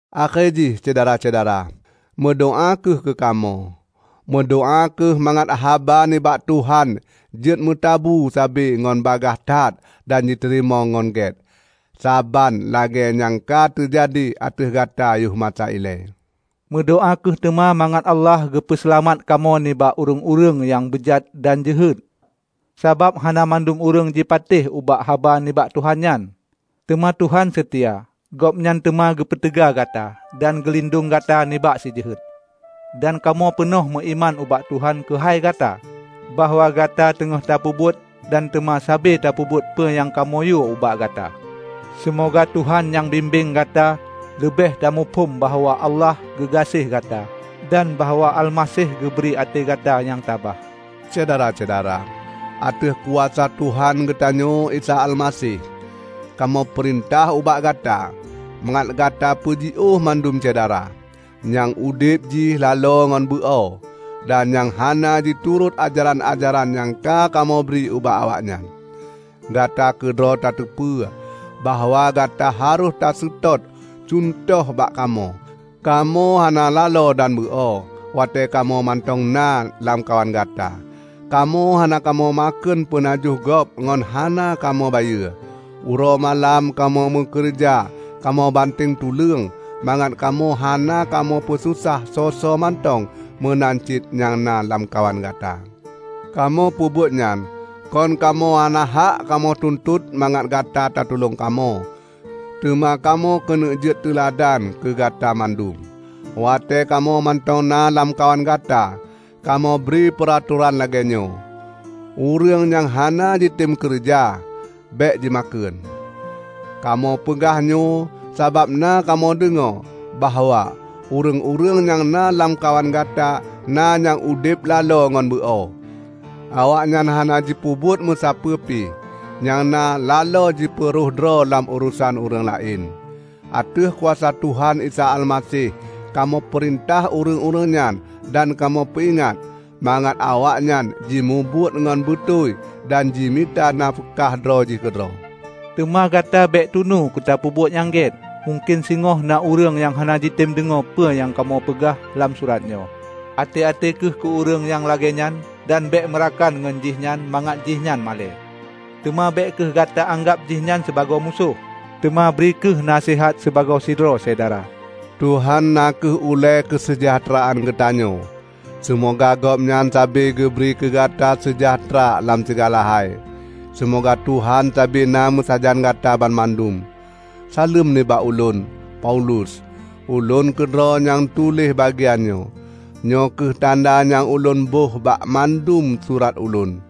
Akhé jih, Syedara-syedara, meudoá kheueh keu kamoe. Meudoá kheueh mangat haba nibak Tuhan jeuet meutabu sabe ngon bagaih that dan jiteurimong ngon gét, saban lagée nyang ka teujadi ateueh gata yoh masa ilée. Meudoá kheueh teuma mangat Allah geupeu seulamat kamoe nibak ureuëng-ureuëng nyang beujat dan jeuhet. Sabab hana mandum ureuëng jipatéh ubak haba nibak Tuhan nyan. Teuma Tuhan seutia. Gobnyan teuma geupeuteuga gata dan geulindong gata nibak Si Jeuhet. Dan kamoe peunoh meuiman ubak Tuhan keuhai gata, bahwa gata teungoh tapeubuet dan teuma sabe tapeubuet peue nyang kamoe yue ubak gata. Seumoga Tuhan nyang bimbeng gata leubeh tamuphom bahwa Allah geugaséh gata dan bahwa Almaseh geubri até gata nyang tabah. Syedara-syedara, ateueh kuasa Tuhan geutanyoe Isa Almaseh, kamoe peurintah ubak gata mangat gata peujiôh mandum syedara, nyang udeb jih laloe ngon beu-o, dan nyang hana jiturot ajaran-ajaran nyang ka kamoe bri ubak awaknyan. Gata keudroe tateupeue bahwa gata harôh taseutôt cuntoh bak kamoe. Kamoe hana laloe dan beu-o watée kamoe mantong na lamkawan gata. Kamoe hana kamoe makheun peunajoh gob ngon hana kamoe bayeue. Uroe malam kamoe meukeureuja kamoe banteng tuleueng mangat kamoe hana kamoe peususah soe-soe mantong meunan cit nyang na lamkawan gata. Kamoe peubuet nyan kon kamoe hana hak kamoe tuntot mangat gata tatulong kamoe, teuma kamoe keuneuk jeuet teuladan keugata mandum. Watée kamoe mantong na lamkawan gata, kamoe bri peuratoran lagée nyoe, "Ureuëng nyang hana jitem keureuja, bék jimakheun." Kamoe peugah nyoe sabab na kamoe deungoe bahwa ureuëng-ureuëng nyang na lamkawan gata na nyang udeb laloe ngon beu-o. Awaknyan hana jipeubuet meusapeue pi, nyang na laloe jipeuroh droe lam urosan ureuëng laén. Ateueh kuasa Tuhan Isa Almaseh kamoe peurintah ureuëng-ureuëng nyan dan kamoe peuingat, mangat awaknyan jimubuet ngon beutôi dan jimita nafeukah droe jih keudroe. Teuma gata bék tunu tapeubuet nyang gét. Mungken singoh na ureuëng nyang hana jitem deungoe peue nyang kamoe peugah lam surat nyoe. Até-até kheueh keu ureuëng nyang lagée nyan dan bék meurakan ngon jihnyan mangat jihnyan malée. Teuma bék kheueh gata anggab jihnyan sibagoe musoh; teuma bri kheueh naseuhat sibagoe sidroe syedara. Tuhan na kheueh ulée keuseujahteuraan geutanyoe. Seumoga Gobnyan sabe geubri keugata seujahteura lam sigala hai. Seumoga Tuhan sabe na meusajan gata banmandum. Saleuem nibak ulôn, Paulus. Ulôn keudroe nyang tuléh bagian nyoe. Nyoe kheueh tanda nyang ulôn boh bak mandum surat ulôn.